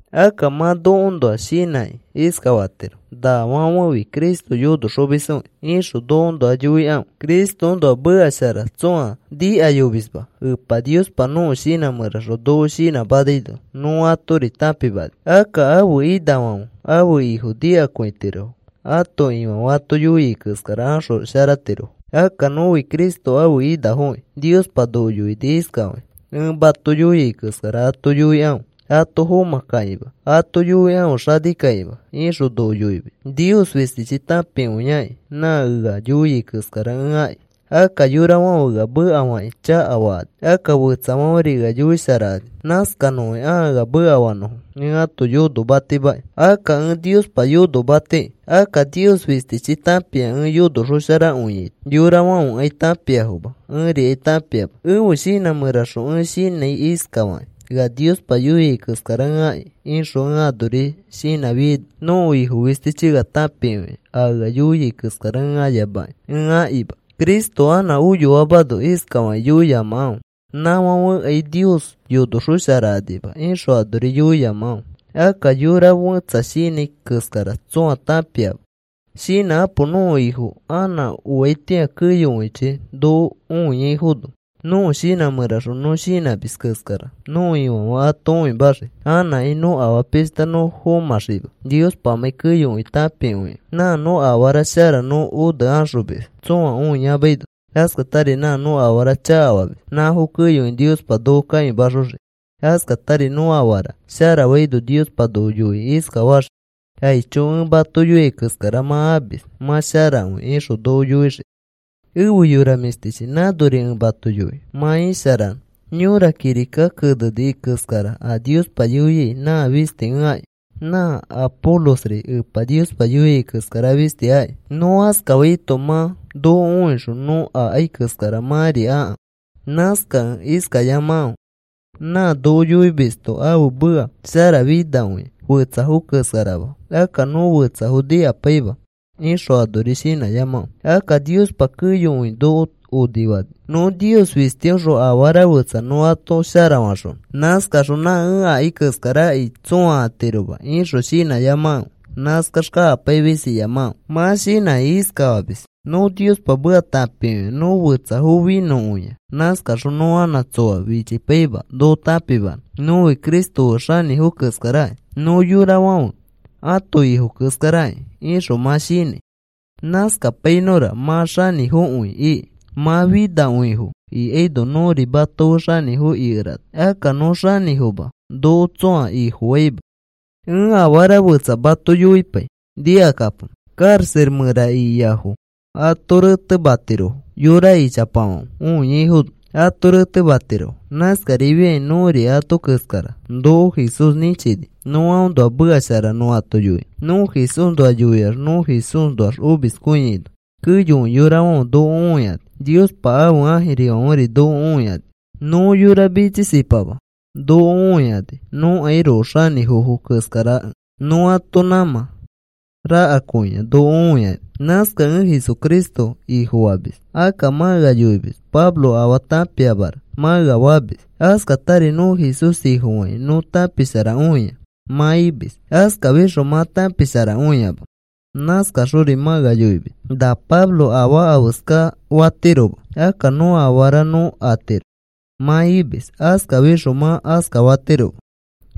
Akka mã nokoõnoa shinãkĩ iskafatiro: “Nafãfefi Cristo yonoxomisfokĩ,” ixõ nokoõnoa yoikãfe. Cristoõnoa meka shara tsõa nikayomisma Epa Niospa nõko shinã mẽraxõ noko shinãmanaino nõ atori tãpimani. Akka ãfe inafãfe ãfe ifo nikakõitirofo. Ãto ifãfe ato yoia keskara axosharatirofo. Akka nõfi Cristo ãfe inafoki. Niospa noko yoini iskafakĩ: “Ẽ mato yoia keskara ato yoikãfe ato fomãkakĩma. Ato yoikãfe xanikakĩma,” ixõ noko yoimis. Nios fistichi tãpikõiakĩ nã ea yoia keskara ẽ aki. Akka yorafãfe ea mekafakĩ chakafakani. Akka fetsafãferi ea yoisharakani. Nãskanõki ãa ea mekafanõfo. Ẽ ãto yonomatimaki. Akka ẽ Niospa yonomatiki. Akka Nios fistichi tãpia ẽ yonoxosharakõiaito. Yorafãfekai tãpiafoma. Ẽrikai tãpiama. Ẽfe shinã mẽraxõ ẽ shinãi iskafakĩ: “Ea Niospa yoiai keskara ẽ aki,” ixõ ẽ anori shinãfiaino nõko Ifo fistichi ea tãpikõia a ea yoia keskara ẽ ayamakĩ ẽ akima. Cristo anã oyoamano iskafakĩ yoiyamakãfe: “Nãfãfekai Nios yonosharaxokanima,” ixõ anori yoiyamakãfe. Akka yora fẽtsa shinãi keskara tsõa tãpiama. Shinãkapo. Nõko Ifo anã oaitĩa keyokõichi noko õiaifono nõko shinã mẽraxõ nõ shinãmis keskara nõko Ifãfe ato õimaxii. Anãkai nõ afaa pishta nõ fomãxiima, Niospamãi keyokõi tãpikõikẽ. Nã nõ afara shara nõ one axomis tsõa õiyamaino, askatari nã nõ afara chakafamis nãfo keyokõi Niospa noko kãimaxoxii. Askatari nõ afara shara faino Niospa noko yoikĩ iskafaxii: “Aicho. Ẽ mato yoia keskara mã amis. Mã sharakõi,” ixõ noko yoixii. Efe yora mĩshtichi, nãnori ẽ mato yoi mã isharanõ. Yõra kirika keneni keskara a Niospa yoiai nã fisti ẽ aki. Nã Apolosri Epa Niospa yoia keskara fisti aki. Nõ askafaito mã noko õixõ nõ akai keskara mãri akãfe. Nãskakẽ iskayamakãfe: “Nã noko yoimisto ãfe meka sharafinakõia, fetsafo keskarama. Akka nõ fetsafo nikapaima,” ixõ anori shinãyamakãfe. Akka Niospa keyokõi noko onifani. Nõ Nios fistiõxõ afara fetsa nõ ato sharafaxonõ. Nãskaxõ, “Nã ẽ akai keskarakai tsõa atiroma,” ixõ shinãyamakãfe. Nãskax kakapaimis iyamakãfe. Mã shinãkĩ iskafamis: “Nõ Niospa meka tãpikõia. Nõ fetsafo finõkõia. Nãskaxõ nõ anã tsoa fichipaima noko tãpimanõ. Nõfi Cristo fe xanĩfo keskaraki. Nõ yorafãfe ãto ifo keskarakĩ,” ixõ mã shinãi. Nãskapainõra mã xanĩfokõifo iki. Mã xanĩfokõifo ikaino nõri mato fe xanĩfo ikerana. Akka nõ xanĩfoma. Noko tsõa ifofaima. Ẽ afara fetsa mato yoipai, nikakapo. Karaxa mẽra ikiafo ato retematirofo. Yora ichapafãfe õiaifono ato retematirofo. Nãskarifiakĩ nõri ato keskara. Noko Jesús nĩchini nõ aõnoa meka shara nõ ato yoinõ. Nõ Jesúsnoa yoiax nõ Jesúsnoax omiskõiaino keyokõi yorafãfe noko õikani. Niospa ãfe ãjirifãferi noko õikani. Nõ yora mitsisipama noko õikani, nõkairoko xanĩfofo keskarakẽ. Nõ ãto nãmã rakakõia noko õikani. Nãskakẽ ẽ Jesucristo Ifofamis. Akka mã ea yoimis: “Pablo afaa tãpiamara,” mã ea famis. Askatari, “Nõ Jesús Ifofakĩ nõ tãpisharakõia,” mã imis. Askafixõ mã tãpisharakõiama. Nãskaxori mã ea yoimis, “Na Pablo afaa afeska fatiroma. Akka nõ afarafo nõ atiro,” mã imis. Askafixõ mã askafatiroma.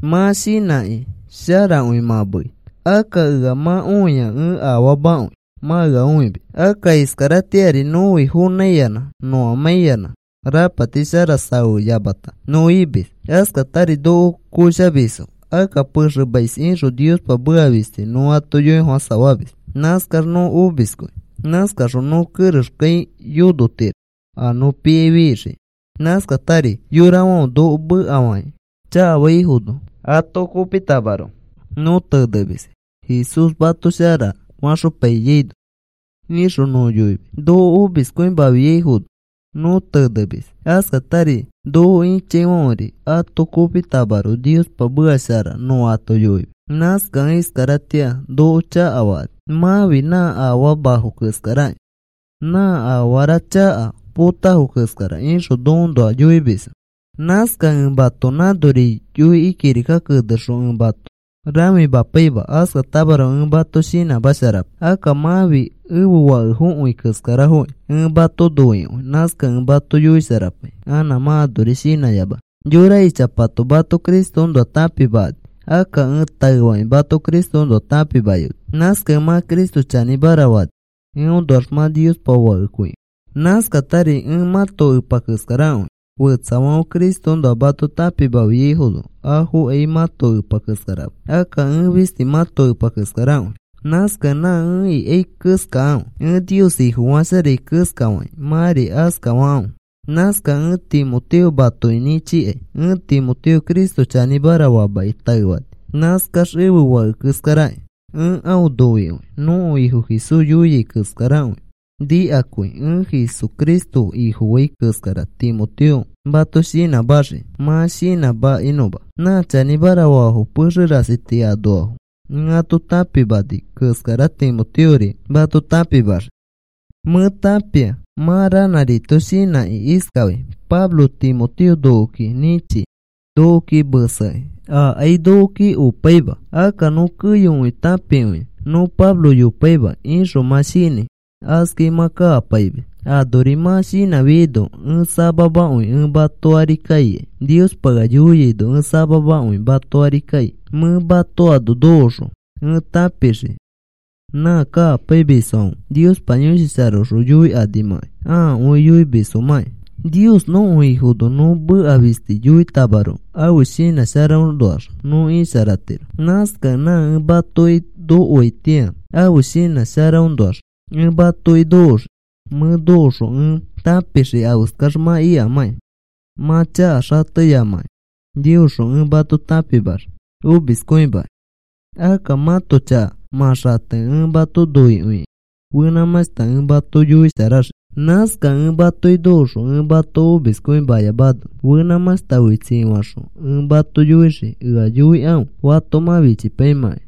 Mã shinãkĩ sharakõi mã meei. Akka ea mã õia ẽ afaamakõi mã ea õimis. Akka iskaratĩari nõfi fonãiyanã nõamaikĩyanã rapati shara safeyamata nõ imis. Askatari noko koshamisfo. Akka pexemais ixõ Niospa meka fisti nõ ato yoifofãsafamis. Nãskax nõ omiskõi. Nãskaxõ nõ kerexkai yonotiro a nõ piai fixiki. Nãskatari yorafãfe noko mekafakĩ chakafaifono ato kopitamaroko nõ tenemis. “Jesús mato shara faxopainõ,” ixõ nõ yoimis. Noko omiskõimafiaifono nõ tenemis. Askatari noko ĩchaifãfe ato kopitamaroko Niospa meka shara nõ ato yoimis. Nãskakẽ iskaratĩa noko chakafakani, “Mãfi nã afamafo keskarakĩ, nã afara chaka potafo keskara,” ixõ nokoõnoa yoimisfo. Nãskakẽ ẽ mato nãnori yoikĩ kirika kenexõ ẽ mato rãfimapaima. Askatamaroko ẽ mato shinãmasharapai. Akka mãfi ẽfe fakekõifo keskarafoki. Ẽ mato noikõi. Nãskakẽ ẽ mato yoisharapai anã mã anorima shinãyamanõ. Yora ichapato mato Cristoõnoa tãpimakani. Akka ẽ taefakĩ mato Cristoõnoa tãpimayoni. Nãskakẽ mã Cristo chanĩmara fani. Eõnoax mã Niospa fakekõifo. Nãskatari ẽ mãto epa keskarakõi. Fetsafãfe Cristoõnoa mato tãpimafiaifono afokai mãto epa keskarama. Akka ẽ fisti mãto epa keskarakõi. Nãskakẽ nã ẽ ikai keskakãfe. Ẽ Nios Ifofasharai keskafakĩ mãri askafakãfe. Nãskakẽ ẽ Timoteo matoki nĩchikai. Ẽ Timoteo Cristo chanĩmara famaki taefani. Nãskax ẽfe fake keskarakĩ. Ẽ aõ noikõi. Nõko Ifo Jesús yoiai keskarakõi nikakõi. Ẽ Jesucristo Ifofai keskara Timoteo mato shinãmaxii mã shinãmakinõma. Nã chanĩmara faafo pexe rasi tii anoafo ẽ ato tãpimani keskara Timoteori mato tãpimaxii. Mẽ tãpia mã ranãrito shinãkĩ iskafai: “Pablo Timoteo nokoki nĩchi nokoki mesekĩ. Ãakai nokoki opaima. Akka nõ keyokõi tãpikõia. Nõ Pablo yopaima,” ixõ mã shinãi. Askai mã kakapaimis. Anori mã shinãfiaino ẽ samamakõi ẽ mato ari kaikai. Niospa ea yoiaino ẽ samamakõi mato ari kai. Mẽ mato ano nokoõxõ ẽ tãpixii nã kakapaimisfãfe Niospa Yõshi Sharaõxõ yoikanimãkai, ãakõi yoimisfomãkĩ. Nios nõko Ifono nõ meka fisti yoitamaroko ãfe shinã sharaõnoax nõ isharatiro. Nãskakẽ nã ẽ matoki nokoaitĩa ãfe shinã sharaõnoax ẽ matoki nokoxii. Mẽ nokoxõ ẽ tãpixii afeskax mã ikamãkĩ. Mã chaka xateyamakẽ Niosxõ ẽ mato tãpimaxii omiskõimakĩ. Akka mãto chaka mã xatekẽ ẽ mato noikõikĩ fenãmãshta ẽ mato yoisharaxii. Nãskakẽ ẽ matoki nokoxõ ẽ mato omiskõimayamano fenãmãshta oi tsii faxõ ẽ mato yoixii ea yoikãfe fato mã fichipaimãkai.